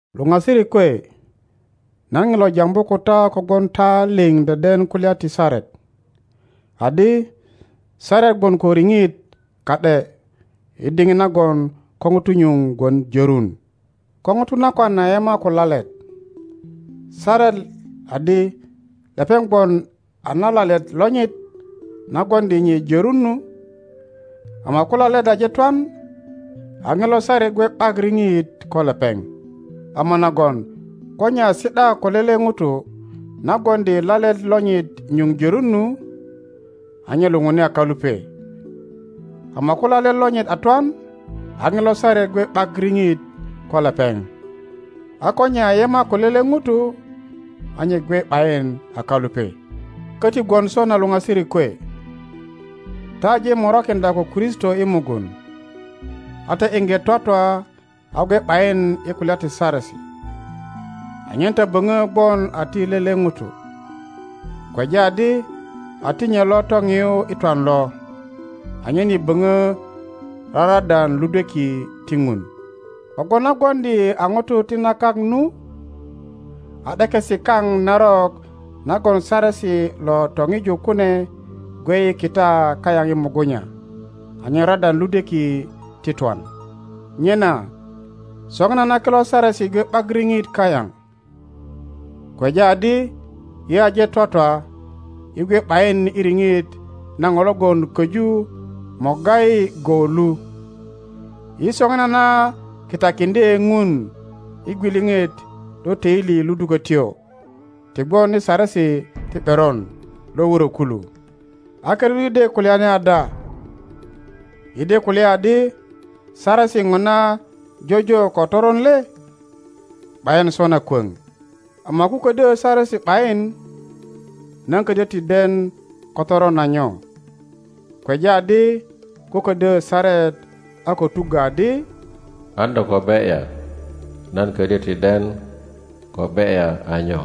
Luŋasirik kwe, nan ŋilo jambu ko ta kogwon ta liŋ deden kulya ti saret, adi saret gwon ko riŋit ka ’de i diŋit nagon ko ŋuto nyuŋ gwon jörun. Ko ŋuto nakwan a yema ko lalet, saret adi lepeŋ gwon a na lalet lonyit na gwoŋdi nye jörun nu, ama ko lalet aje twan, a ŋilo saret gwe ’bak riŋit ko lepeŋ. Ama nagon ko nye a si ’da ko lele ŋuto na gwoŋdi lalet lonyit nyuŋ jörun nu, a nye luŋuni a kalupe, ama ko lalet lonyit a twan, a ŋilo saret gwe ’bak riŋit ko lepeŋ, a ko nye a yema ko lele ŋuto a nye gwe ’bayin a kalupe. Köti gwon sona luŋasirik kwe, ta aje morakiŋdya ko Kristo i mugun, a ta iŋge twatwa a gwe ’bayin i kulya ti Saresi, anyen ta böŋö gwon a ti lele ŋuto, kweja adi a ti nye lo toŋiyu i twan lo, anyen yi böŋö raradan ludweki ti Ŋun. Kogwon na gwoŋdi yi a ŋutu ti na kak nu, a ’dekesi kaŋ narok nagon Saresi lo toŋiju kune gwe i kita kayaŋ i mugunya anyen radan ludweki ti twan. Nyena soŋinana kilo Saresi gwe ’bak riŋit kayaŋ, kweja adi yi aje twatwa yi gwe ’bayin i riŋit na ŋo logon köju morga yi go lu; yi soŋinana kitakiŋdye Ŋun i gwiliŋit lo töili ludukötyo ti gwon i saresi ti ’beron lo wurö kulu. A kirut yi de kulyani ada? Yi de kulya adi Saresi ŋona jojo ko toron le? ’Bayin sona kwöŋ. Ama ko ködyo Saresi ’bayin, nan ködyö ti den ko toron a nyo. Kweja adi ko ködyö saret a ko tuggö adi, An do ko be ’ya, nan ködyö ti den ko be ’ya a nyo.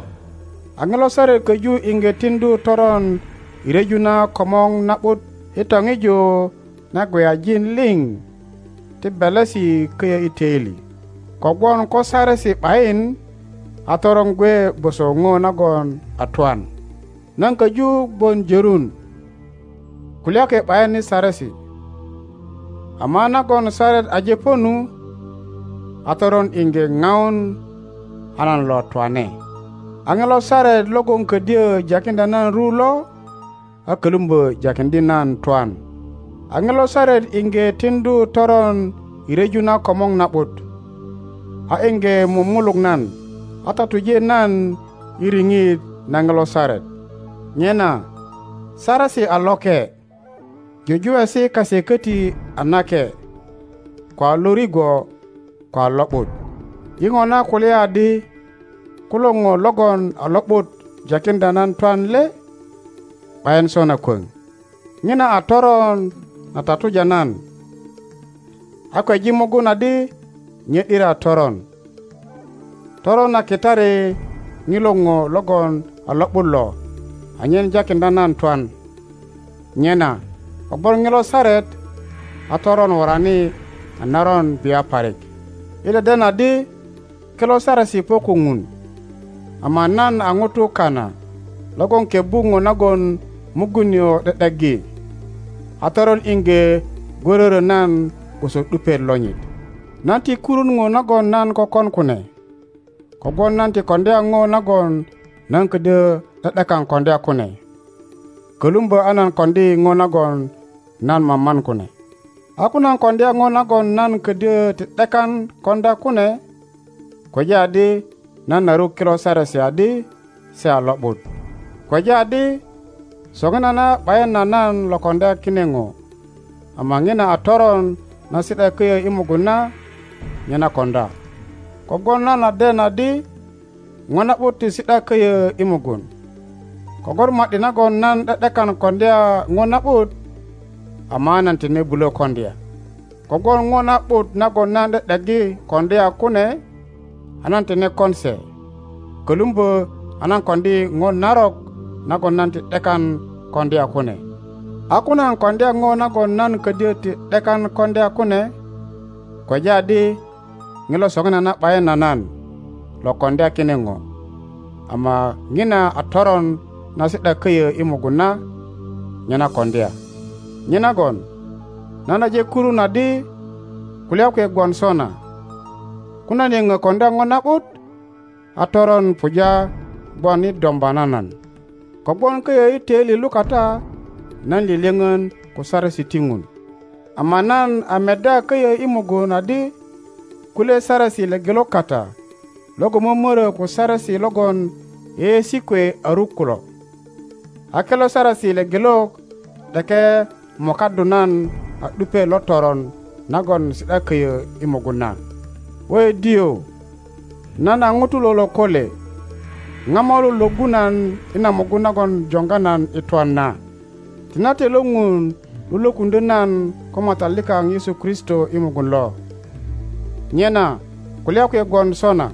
A ŋilo saret köju iŋge tiŋdu toron i ryeju na komor na ’but i toŋiju na gweyajin liŋ ti belesi köyö i töili. Kogwon ko Saresi ’bayin, a toron gwe gwoso ŋo nagon a twan. Nan köju gwon jörun, kulya kwe ’bayin i Saresi, ama a nagon saret aje po nu, a toron iŋge ŋaun a nan lo twane. A ŋilo saret logon ködyö jakiŋdya nan ru lo, a kölumbö jakiŋdye nan twan. A ŋilo saret iŋge tiŋdu toron i ryeju na komor na ’but, a iŋge mumuluk nan, a tatuje nan i riŋit na ŋilo saret. Nyena Saresi a loke, jujuwesi kase köti a nake, ko a lo rigwo, ko a lo ’but. Yi ŋona kulya adi kulo ŋo logon a lo ’but jakiŋdya nan twan le? ’Bayin sona kwöŋ.Ŋina a toron na tatuja nan, a kweji mugun adi nye ’diri a toron. Toron a kitari ŋilo ŋo logon a lo ’but lo anyen jakiŋdya nan twan, nyena kogwon ŋilo saret, a toron worani a naron bia parik. Yi deden adi kilo Saresi po ko Ŋun; ama nan a ŋuto kana logon kebbu ŋo nagon mugun nio ’de ’deggi, a toron iŋge gwörörö nan gwoso ’dupiet lonyit. Nan ti kurun ŋo nagon nan kökon kune, kogwon nan ti koŋdya ŋo nagon nan ködyö ’de ’dekan koŋdya kune, kölumbö a nan koŋdi ŋo nagon nan maman kune. A ko nan koŋdya ŋo nagon nan ködyö ti ’dekan koŋdya kune, kweja adi nan a ruk kilo Saresi adi se a lo ’but. Kweja adi soŋinana ’bayin a nan lo koŋdya kine ŋo, ama ŋina a toron na si ’da köyö i mugun na, nye na koŋdya. Kogwon nan a den adi ŋo na ’but ti si ’da köyö i mugun, kogwon ma ’di nagon nan ’de ’dekan koŋdya ŋo na ’but, ama a nan tine bulö koŋdya. Kogwon ŋo na ’but nagon nan ’de ’deggi koŋdya kune a nan tine kon se, kölumbö a nan koŋdi ŋo narok nagon nan ti ’dekan koŋdya kune. A ko nan koŋdya ŋo nagon nan ködyö ti ’dekan koŋdya kune, kweja adi ŋilo soŋinana ’bayin a nan lo koŋdya kine ŋo, ama ŋina a toron na si ’da köyö i mugun na, nye na koŋdya. Nyenagon nan aje kurun adi kulya kwe gwon sona, ko nan yöŋö koŋdya ŋo na ’but, a toron puja gwon i domba na nan. Kogwon köyö i töili lukata nan lyölyöŋön ko Saresi ti Ŋun, ama nan a meddya köyö i mugun adi kulye saresi lepelok kata logon mömörö ko Saresi logon yeyeesi kwe a ruk kulo, a kilo saresi lepelok ’deke mokaddu nan a ’dupiet lo toron nagon si ’da köyö i inugun na. Wöidiö! nan a ŋuto lo lokole! Ŋa mo lo lwöggu nan i na mugun nagon joŋga nan i twan na? Tinate lo Ŋun lo lwökuŋdyö nan ko Matat likaŋ Yesu Kristo i mugun lo! Nyena kulya kwe gwon sona,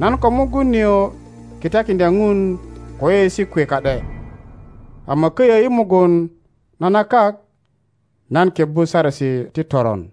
nan ko mugun nio kitakiŋdya Ŋun ko yeyeesi kwe ka ’de, ama köyö i mugun na na kak nan kebbu saresi ti toron.